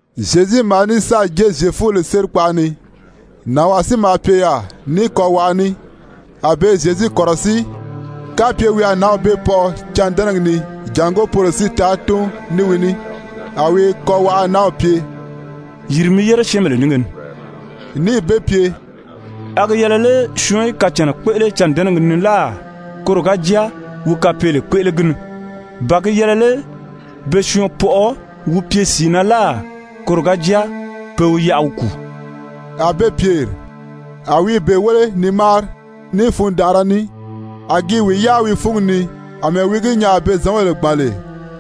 Zyezu maa ní sáà jée Zyefubèle sérikpaʔa ni. Nànwaa si maa pye yaà ní kɔwaʔa ní. A be i Zyezu kɔ̀rɔsíi kapye wi a nǎnw bee pɔʔɔ cândɛnɛgi ni jàngó poro si taa tún ní wi ní. A wi kɔwaʔa nanw pye: «Yìri mi yére syɛ́ɛnbèle nínge ni.» Níì be pye: «A gi yɛlɛ lé syɔɔn í kacànna kpéʔele cândɛnɛgi ni láà, koro ga jáa wi kapeele kpéʔele gi ni? Ba gi yɛlɛ lé be syɔɔn pɔʔɔ wi pye sìi na láà, koro ga jáa pe wi yaʔa wi kùu?» A be pyèri. A wi i be wéle ni máari ní fundanʔara ní, a gi i wi yáa wi fúngi ni àmɛɛ wi gi nyaa a be zɔ̌nbèle gbàn lè,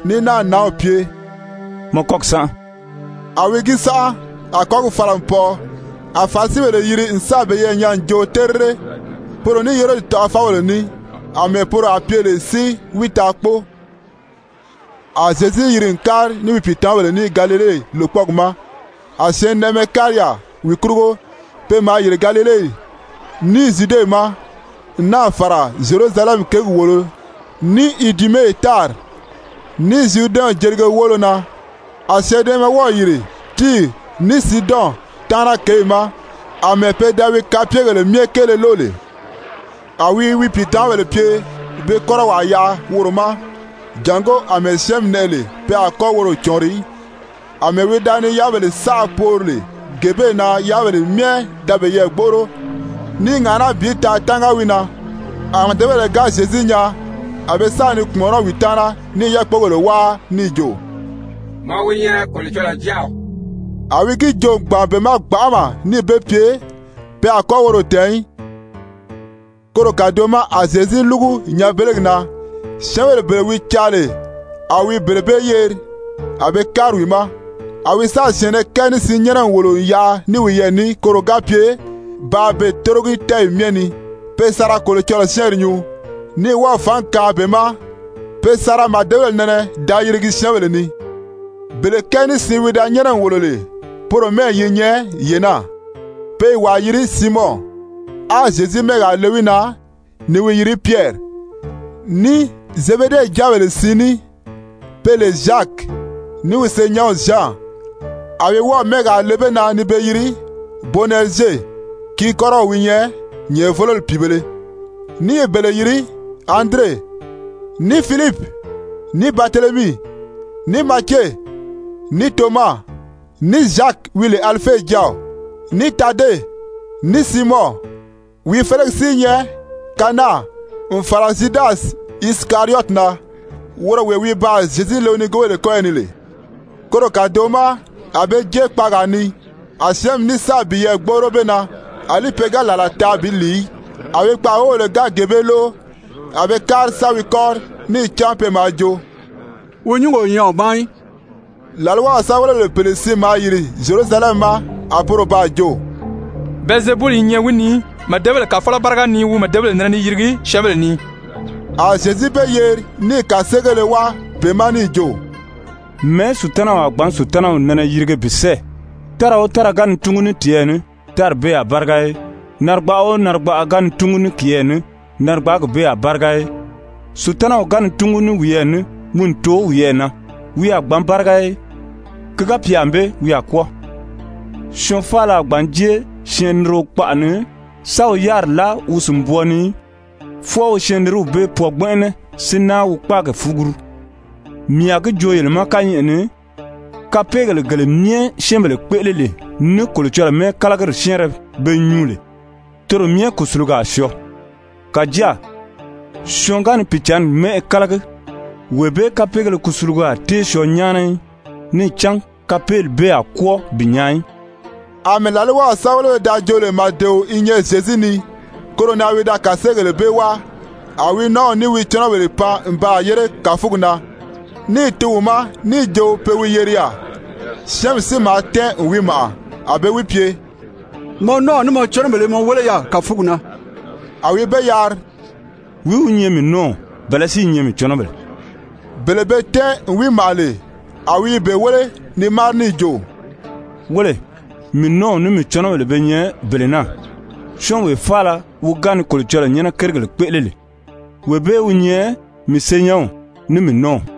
ní náà nǎnw pye: «Mɔ kɔ́gi sánʔa.» A wi gi sánʔa, a kɔ́gi fala n pɔʔɔ. A Farisibèle yiri n sáà peyɛɛ nyaa n jo terire, poro ní Herodi taʔafɔbèle ní, àmɛɛ poro a pye lè si wi taa kpóo. A Zyezu yiri n kári ní wi pìitamabèle ní Galile lòkpɔɔgi ma. A syɛɛnnɛʔɛmɛ kári yaà wi kurugo. Pe maa yìri Galile, ní Zyude ma, n náà fàra Zyerusalɛmi kěgi wòolo ní Idume tári, ní Zyuridɛnw jelige woolo na, a syɛɛnnɛʔɛmɛ wɔ́ɔ̀ yìri Tiiri ní Siidɔn taana kěyi ma, àmɛɛ pe da wi kapyegèle myɛ kéele lóʔo lè. A wi wi pìitamabèle pye be kɔ́rɔwaa yaʔa woro ma, jàngó àmɛɛ syɛ́ɛnmi nɛʔɛ lè pe a kɔ́ woro cɔ̀ɔnri í. Amɛɛ wi da ni yáabèle saʔa poori lè gee bee na yáabèle myɛ da peyɛɛ gbóʔoro ní i ŋàʔaná bi taa tánga wi na. A màdebèle ga Zyezu nyaa, a be sa ni kpùmɔnɔ́ wi taana ní i yákpogèle wáa níì jo: «Mɔ wi nyɛ Kolocɔlɔɔ Jáaw.» A wi gi joo n gbàn be ma gbanʔama níì be pye pe a kɔ́ woro tɛ̀ɛn í. Koro kàdoʔo ma a Zyezu lúgu nyanbelegi na, syɛ́ɛnbèle bele wi caa lè, a wi bele bee yeri, a be kári wi ma. A wi sáà syɛ̀ɛnnɛ kɛɛ ní siin nyɛ́nɛ n wòlo n yaʔa ní wiyɛɛ ní koro ga pye bàā be tórogi tɛ́ɛyi myɛ ni, pe sa ra Kolocɔlɔɔ syɛ́ɛnri nyuu, ní wɔ́ɔ̀ fǎngi kaan be ma pe sa ra màdebèle nɛnɛ da yirigi syɛ́ɛnbèle ni. Bele kɛɛ ní siin wi da nyɛ́nɛ n wòlo lè, poro mɛ́ɛyi yi nyɛ yee naa: Pe i wàa yiri Siimɔn, a Zyezu mɛ́ɛgaa le wi na ni wi yiri Pyɛri, ní Zebede jáabèle siin ní, pe lè Zyaki, ní wi senyɛnw Zyan, a wi wɔ́ɔ̀ mɛ́ɛgaa le be na ni be yiri Bonɛrizye, gi kɔ́rɔw wi nyɛ nyɛ̀ʔɛvōloli pìibēle, ní i bele yiri Andire, ní Filipi, ní Baritelemii, ní Matye, ní Toma, ní Zyaki wi lè Alife jáaw, ní Tade, ní Siimɔn, wi félegi si i nyɛ Kanaan, n fàra Zyudasi Isikariyɔti na, woro wee wi baa Zyezu le wi nigoobèle kɔ́yɔ ni lè. Koro kàdoʔo ma a be jée kpaagaa ni, a syɛ́ɛnmi ní sáà piyɛɛ gbóʔoro be na, àlí pe ga làla taa bi lìi í. A wi kpaʔa wóbèle ga gee bee lóʔo, a be kári sa wi kɔ́ri, níì cán pe maa jo: «Wi nyúngi o nyɛ wi ma í.» Làlwaw sɛ́bɛwelebèle pèle si maa yìri Zyerusalɛmi ma a poro baa jo: «Bɛlizebuli i nyɛ wi ni. Màdebèle kàfɔlɔ báriga ni wi màdebèle nɛnɛ ni yirigi syɛ́ɛnbèle ni.» A Zyezu be yeri níì kàseegéle wáa be ma níì jo: «Mɛ̀ɛ́ Sutanaw a gbǎn Sutanaw nɛnɛ yirige bi sɛ́ɛ? Tára o tára ga ni túngu ní tiyɛɛ ní, tári bee a báriga í. Narigbaʔa o narigbaʔa ga ni túngu ní kiyɛɛ ní, narigbaagi bee a báriga í. Sutanaw ga ni túngu ní wiyɛɛ ní wi n too wiyɛɛ na, wi a gbǎn báriga í, ki ga pye ànbée wi a kwɔ́ɔ. Syɔɔn faala a gbǎn jée syɛɛnnirio kpaʔa ni sa wi yáriri láa wi sìnbwɔɔ ni í, fwɔɔ wi syɛɛnniriw bee pwɔɔ gbɛnʔɛnɛ si náa wi kpáagi fuguru. Mii a gi joo yele ma kányɛʔɛ ni, kapeegèle gele myɛ syɛ́ɛnbèle kpéʔele lè ní Kolocɔlɔɔ mɛ́ɛkalagiri syɛ́ɛnrɛ be nyuu lè, toro myɛ kùsulugi a syɔɔ. Kàjáa syɔɔn ga ni Pìicǎnni mɛ́ʔɛ kálagi, wee bee kapeegéle kusulugo a tée syɔɔ nyáana í, níì cán kapeeli bee a kwɔ́ɔ bi nyaa í.» Amɛɛ làlwaw sɛ́bɛwelebéle da jo lè màdeo i nyɛ Zyezu ni, koro na wi da kàseegèle bee wáa. A wi nɔ́ɔw ní wi cɔnɔbèle pan n baa yére kàfugi na níì tun wi ma, níì jo pe wi yeri yaà. Syɛ́ɛnmi si maa tɛ́ɛn n wi màʔa, a be wi pye: «Mɔ nɔ́ɔw ní mɔ cɔnɔbèle i mɔ wéle yaà kàfugi na.» A wi be yari: «Wìí wi nyɛ mii nɔ́ɔw, bɛ̀lɛ́ si i nyɛ mii cɔnɔbèle?» Bele be tɛ́ɛn n wi màʔa lè, a wi i be wéle ni máari níì jo: «Wéle, mii nɔ́ɔw ní mii cɔnɔbèle be nyɛ bele naa. Syɔ́ɔnwee faala wi ga ni Kolocɔlɔɔ nyɛ́nɛ kérigèle kpéʔele lè, wee bee wi nyɛ mii senyɛnw ní mii nɔ́ɔw.»